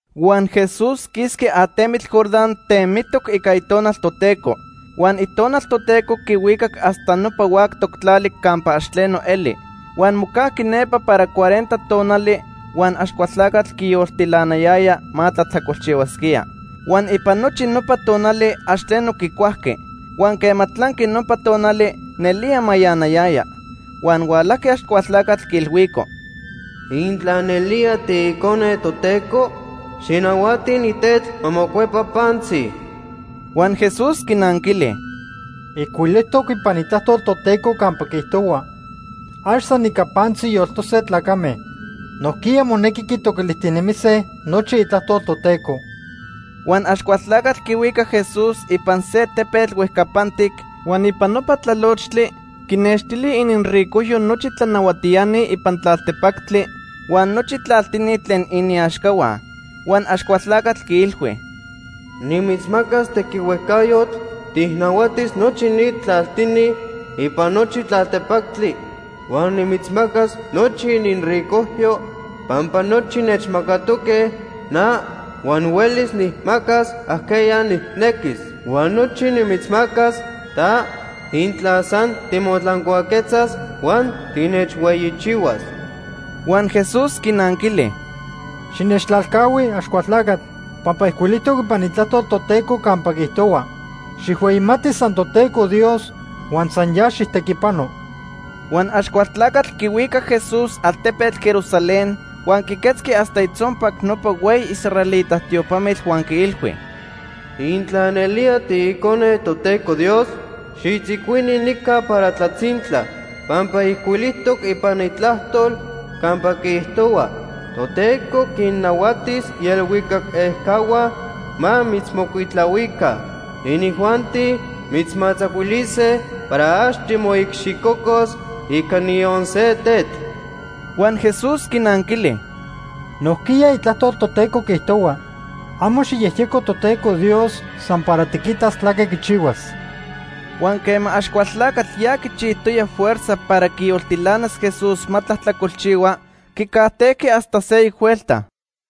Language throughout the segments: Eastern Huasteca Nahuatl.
Huan Jesús quisqui atemitl Jordán temitoc ica Itonal Toteco. Huan Itonal Toteco quihuicac hasta nopa huactoc tlali campa ax tleno eli. Huan mocajqui nepa para cuarenta tonali huan Axcualtlacatl quiyoltilanayaya ma tlajtlacolchihuasquía. Huan ipan nochi nopa tonali ax tleno quicuajqui. Huan quema tlanqui nopa tonali, nelía mayanayaya. Huan hualajqui Axcualtlacatl quiilhuico: ―Intla nelía tiIcone Toteco, xijnahuati ni tetl ma mocuepa pantzi. Huan Jesús quinanquili: ―Ijcuilijtoc ipan Itlajtol Toteco campa quiijtohua: ‘Ax san ica pantzi yoltose tlacame. Nojquiya monequi quitoquilijtinemise nochi Itlajtol Toteco.’ Huan Axcualtlacatl quihuicac Jesús ipan se tepetl huejcapantic, huan ipan nopa tlalochtli quinextili ininricojyo nochi tlanahuatiani ipan tlaltepactli huan nochi tlaltini tlen iniaxcahua. Huan Axcualtlacatl quiilhui: ―Nimitzmacas tequihuejcayotl tijnahuatis nochi ni tlaltini ipan nochi tlaltepactli huan nimitzmacas nochi ininricojyo, pampa nochi nechmacatoque na huan huelis nijmacas ajqueya nijnequis. Huan nochi nimitzmacas ta intla san timotlancuaquetzas huan tinechhueyichihuas. Huan Jesús quinanquili: ―Xinechtlalcahui, Axcualtlacatl, pampa ijcuilijtoc ipan Itlajtol Toteco campa quiijtohua: ‘Xijhueyimati san Toteco Dios huan san ya xijtequipano.’ Huan Axcualtlacatl quihuicac Jesús altepetl Jerusalén huan quiquetzqui hasta itzonpac nopa hueyi israelita tiopamitl huan quiilhui: ―Intla nelía tiIcone Toteco Dios, xitzicuini nica para tlatzintla, pampa ijcuilijtoc ipan Itlajtol campa quiijtohua: ‘Toteco quinnahuatis ielhuicac ejcahua ma mitzmocuitlahuica. Inijuanti mitzmatzacuilise para ax timoicxicocos ica niyon se tetl.’ Huan Jesús quinanquili: ―Nojquiya Itlajtol Toteco quiijtohua: ‘Amo xijyejyeco Toteco Dios san para tiquitas tlaque quichihuas.’ Huan quema Axcualtlacatl ya quichijtoya fuerza para quiyoltilanas Jesús ma tlajtlacolchihua, quicajtejqui hasta seyoc huelta.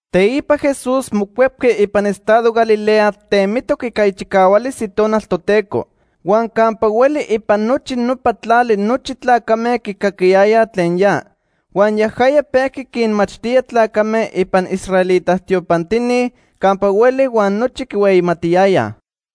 Teipa Jesús mocuepqui ipan estado Galilea temitoc ica ichicahualis Itonal Toteco. Huan campa hueli ipan nochi nopa tlali nochi tlacame quicaquiyayaj tlen ya. Huan yajaya pejqui quinmachtía tlacame ipan israelita tiopantini campa hueli huan nochi quihueyimatiyayaj.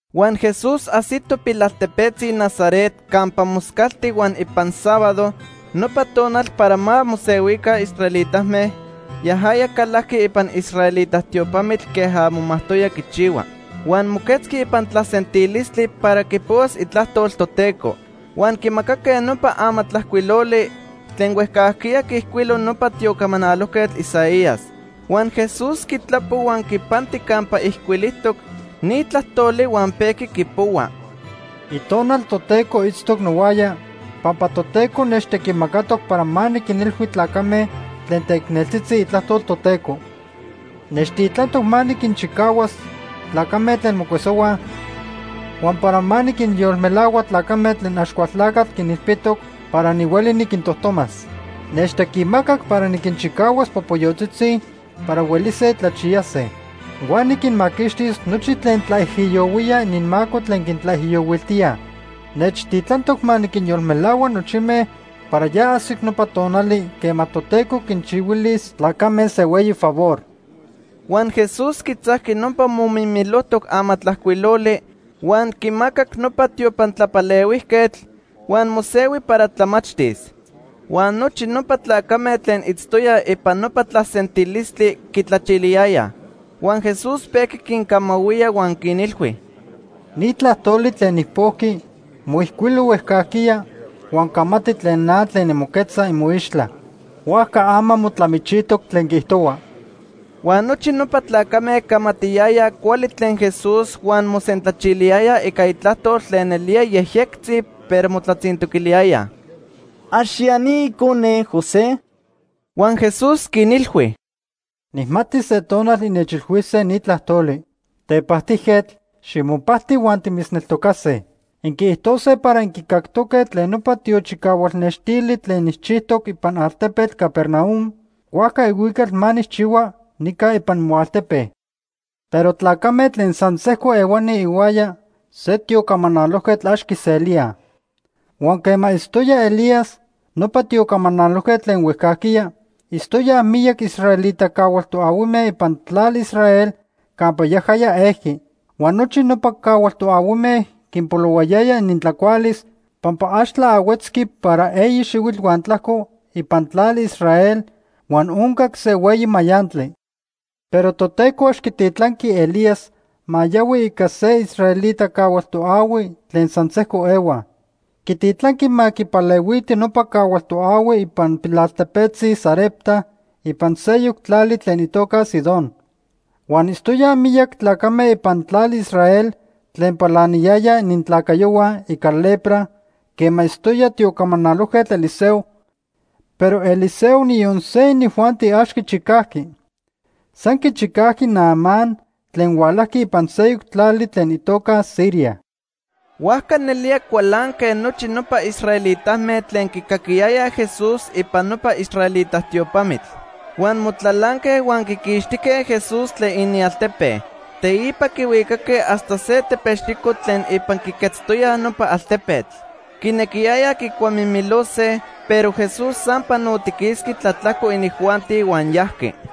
Huan Jesús ajsito pilaltepetzi Nazaret campa moscalti huan ipan sábado, nopa tonal para ma mosehuica israelitame, yajaya calajqui ipan israelita tiopamitl queja momajtoya quichihua. Huan moquetzqui ipan tlasentilistli para quipohuas Itlajtol Toteco. Huan quimacaque nopa amatlajcuiloli tlen huejcajquiya quiijcuilo nopa tiocamanalojquetl Isaías. Huan Jesús quitlapo huan quipanti campa ijcuilijtoc ni tlajtoli huan pejqui quipohua: “Itonal Toteco itztoc nohuaya, pampa Toteco nechtequimacatoc para ma niquinilhui tlacame tlen teicneltzitzi itlajtol Toteco. Nechtitlantoc ma niquinchicahuas tlacame tlen mocuesohuaj, huan para ma niquinyolmelahua tlacame tlen Axcualtlacatl quinilpitoc para nihueli niquintojtomas. Nechtequimacac para niquinchicahuas popoyotzitzi para huelise tlachiyase. Huan niquinmaquixtis nochi tlen tlaijiyohuíaj ininmaco tlen quintlaijiyohuiltíaj. Nechtitlantoc ma niquinyolmelahua nochime para ya ajsic nopa tonali, quema Toteco quinchihuilis tlacame se hueyi favor.” Huan Jesús quitzajqui nopa momimilojtoc amatlajcuiloli huan quimacac nopa tiopan tlapalehuijquetl, huan mosehui para tlamachtis. Huan nochi nopa tlacame tlen itztoyaj ipan nopa tlasentilistli quitlachiliyayaj. Huan Jesús pejqui quincamahuía huan quinilhui: ―Ni tlajtoli tlen nijpojqui moijcuilo huejcajquiya huan camati tlen na tlen nimoquetza imoixtla. Huajca ama motlamichijtoc tlen quiijtohua. Huan nochi nopa tlacame camatiyayaj cuali tlen Jesús huan mosentlachiliyayaj ica itlajtol tlen nelía yejyectzi, pero motlatzintoquiliyayaj: ―¿Ax ya ni icone José? Huan Jesús quinilhui: ―Nijmati se tonal innechilhuise ni tlajtoli: ‘Tepajtijquetl, ximopajti, huan timitzneltocase.’ Inquiijtose para inquicactoque tlen nopa tiochicahualnextili tlen nijchijtoc ipan altepetl Capernaum, huajca ihuical ma nijchihua nica ipan imoaltepe. Pero tlacame tlen san sejco ehuani ihuaya se tiocamanalojquetl ax quiselíaj. Huan quema itztoya Elías, nopa tiocamanalojquetl tlen huejcajquiya, itztoyaj miyac israelita cahual toahuime ipan tlali Israel campa yajaya ejqui. Huan nochi nopa cahual toahuime quinpolohuayaya inintlacualis pampa ax tlaahuetzqui para eyi xihuitl huan tlajco ipan tlali Israel huan oncac se hueyi mayantli. Pero Toteco ax quititlanqui Elías ma yahui ica se israelita cahual toahui tlen san sejco ehuaj. Quititlanqui ma quipalehuiti nopa cahual toahui ipan pilaltepetzi Sarepta ipan seyoc tlali tlen itoca Sidón. Huan itztoyaj miyac tlacame ipan tlali Israel tlen palaniyayaj inintlacayohua ica lepra quema itztoya tiocamanalojquetl Eliseo, pero Eliseo niyon se inijuanti ax quichicajqui. San quichicajqui Naamán tlen hualajqui ipan seyoc tlali tlen itoca Siria. Huajca nelía cualanque nochi nopa israelitame tlen quicaquiyayaj Jesús ipan nopa israelita tiopamitl. Huan motlalanque huan quiquixtijque Jesús tlen inialtepe. Teipa quihuicaque hasta se tepexico tlen ipan quiquetztoyaj nopa altepetl. Quinequiyayaj quicuamimilose, pero Jesús san panotiquisqui tlatlajco inijuanti huan yajqui.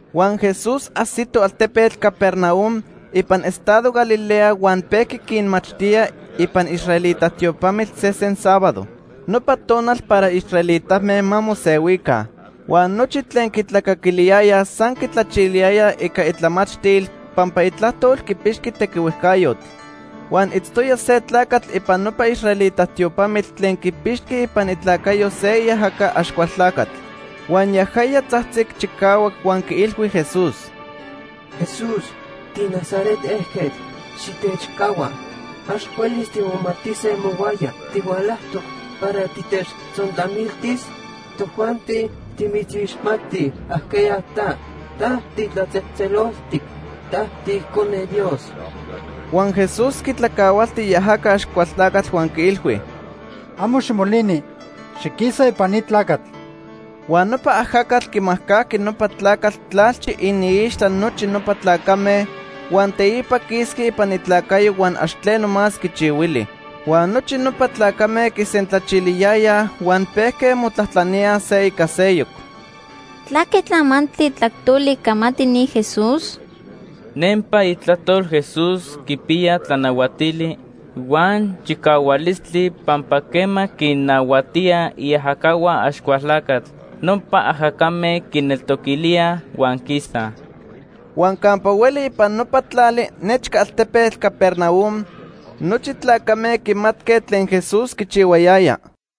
Huan Jesús ajsito altepetl Capernaum ipan estado Galilea huan pejqui quinmachtía ipan israelita tiopamitl sesen sábado, nopa tonal para israelitame ma mosehuica. Huan nochi tlen quitlacaquiliyayaj san quitlachiliyayaj ica itlamachtil pampa itlajtol quipixqui tequihuejcayotl. Huan itztoya se tlacatl ipan nopa israelita tiopamitl tlen quipixqui ipan itlacayo se iajaca Axcualtlacatl. Huan yajaya tzajtzic chicahuac huan quiilhui Jesús: ―Jesús, tiNazaret ejquetl, xitechcahua. Ax huelis timomatise mohuaya. ¿Tihualajtoc para titechtzontlamiltis? Tojuanti timitzixmatij ajqueya ta. Ta titlatzejtzeloltic. Ta tiIcone Dios. Huan Jesús quitlacahualti iajaca Axcualtlacatl huan quiilhui: ―Amo ximolini. Xiquisa ipan ni tlacatl. Huan nopa ajacatl quimajcajqui nopa tlacatl tlalchi iniixtla nochi nopa tlacame, huan teipa quisqui ipan itlacayo huan ax tleno más quichihuili. Huan nochi nopa tlacame quisentlachiliyayaj huan pejque motlajtlaníaj se ica seyoc: ―¿Tlaque tlamantli tlajtoli camati ni Jesús? Nempa itlajtol Jesús quipiya tlanahuatili huan chicahualistli pampa quema quinnahuatía iajacahua Axcualtlacatl, nopa ajacame quineltoquilíaj huan quisaj. Huan campa hueli ipan nopa tlali nechca altepetl Capernaum nochi tlacame quimatque tlen Jesús quichihuayaya.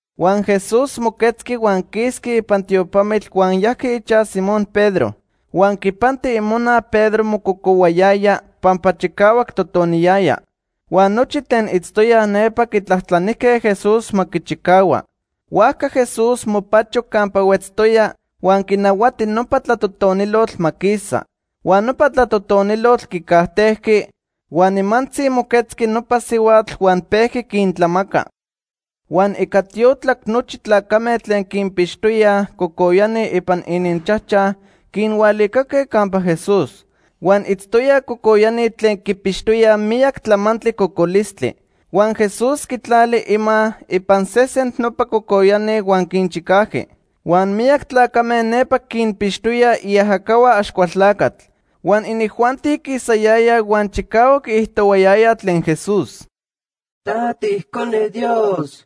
Huan Jesús moquetzqui huan quisqui ipan tiopamitl huan yajqui ichaj Simón Pedro. Huan quipanti imona Pedro mococohuayaya pampa chicahuac totoniyaya. Huan nochi tlen itztoyaj nepa quitlajtlanijque Jesús ma quichicahua. Huajca Jesús mopacho campa huetztoya huan quinahuati nopa tlatotonilotl ma quisa. Huan nopa tlatotonilotl quicajtejqui, huan nimantzi moquetzqui nopa sihuatl huan pejqui quintlamaca. Huan ica tiotlac nochi tlacame tlen quinpixtoyaj cocoyani ipan ininchajchaj quinhualicaque campa Jesús. Huan itztoyaj cocoyani tlen quipixtoya miyac tlamantli cocolistli. Huan Jesús quitlali ima ipan sesen nopa cocoyani huan quinchicajqui. Huan miyac tlacame nepa quinpixtoyaj iajacahua Axcualtlacatl. Huan inijuanti quisayayaj huan chicahuac quiijtohuayayaj tlen Jesús: ―Ta tiIcone Dios.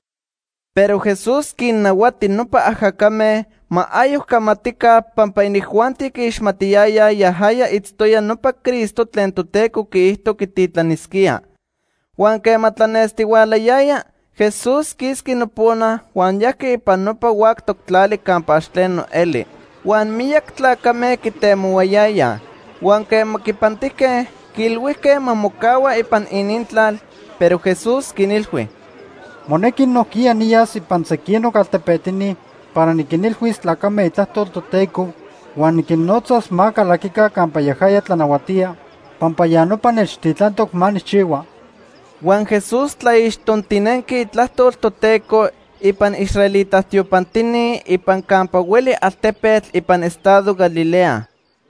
Pero Jesús quinnahuati nopa ajacame ma ayoc camatica pampa inijuanti quiixmatiyayaj yajaya itztoya nopa Cristo tlen Toteco quiijto quititlanisquía. Huan quema tlanestihualayaya, Jesús quisqui nopona, huan yajqui ipan nopa huactoc tlali campa ax tleno eli. Huan miyac tlacame quitemohuayayaj. Huan quema quipantijque, quiilhuijque ma mocahua ipan inintlal. Pero Jesús quinilhui: ―Monequi nojquiya niyas ipan sequinoc altepetini para niquinilhuis tlacame itlajtol Toteco huan niquinnotzas ma calaquica campa yajaya tlanahuatía, pampa ya nopa nechtitlantoc ma nijchihua. Huan Jesús tlaixtontinenqui itlajtol Toteco ipan israelita tiopantini ipan campa hueli altepetl ipan estado Galilea.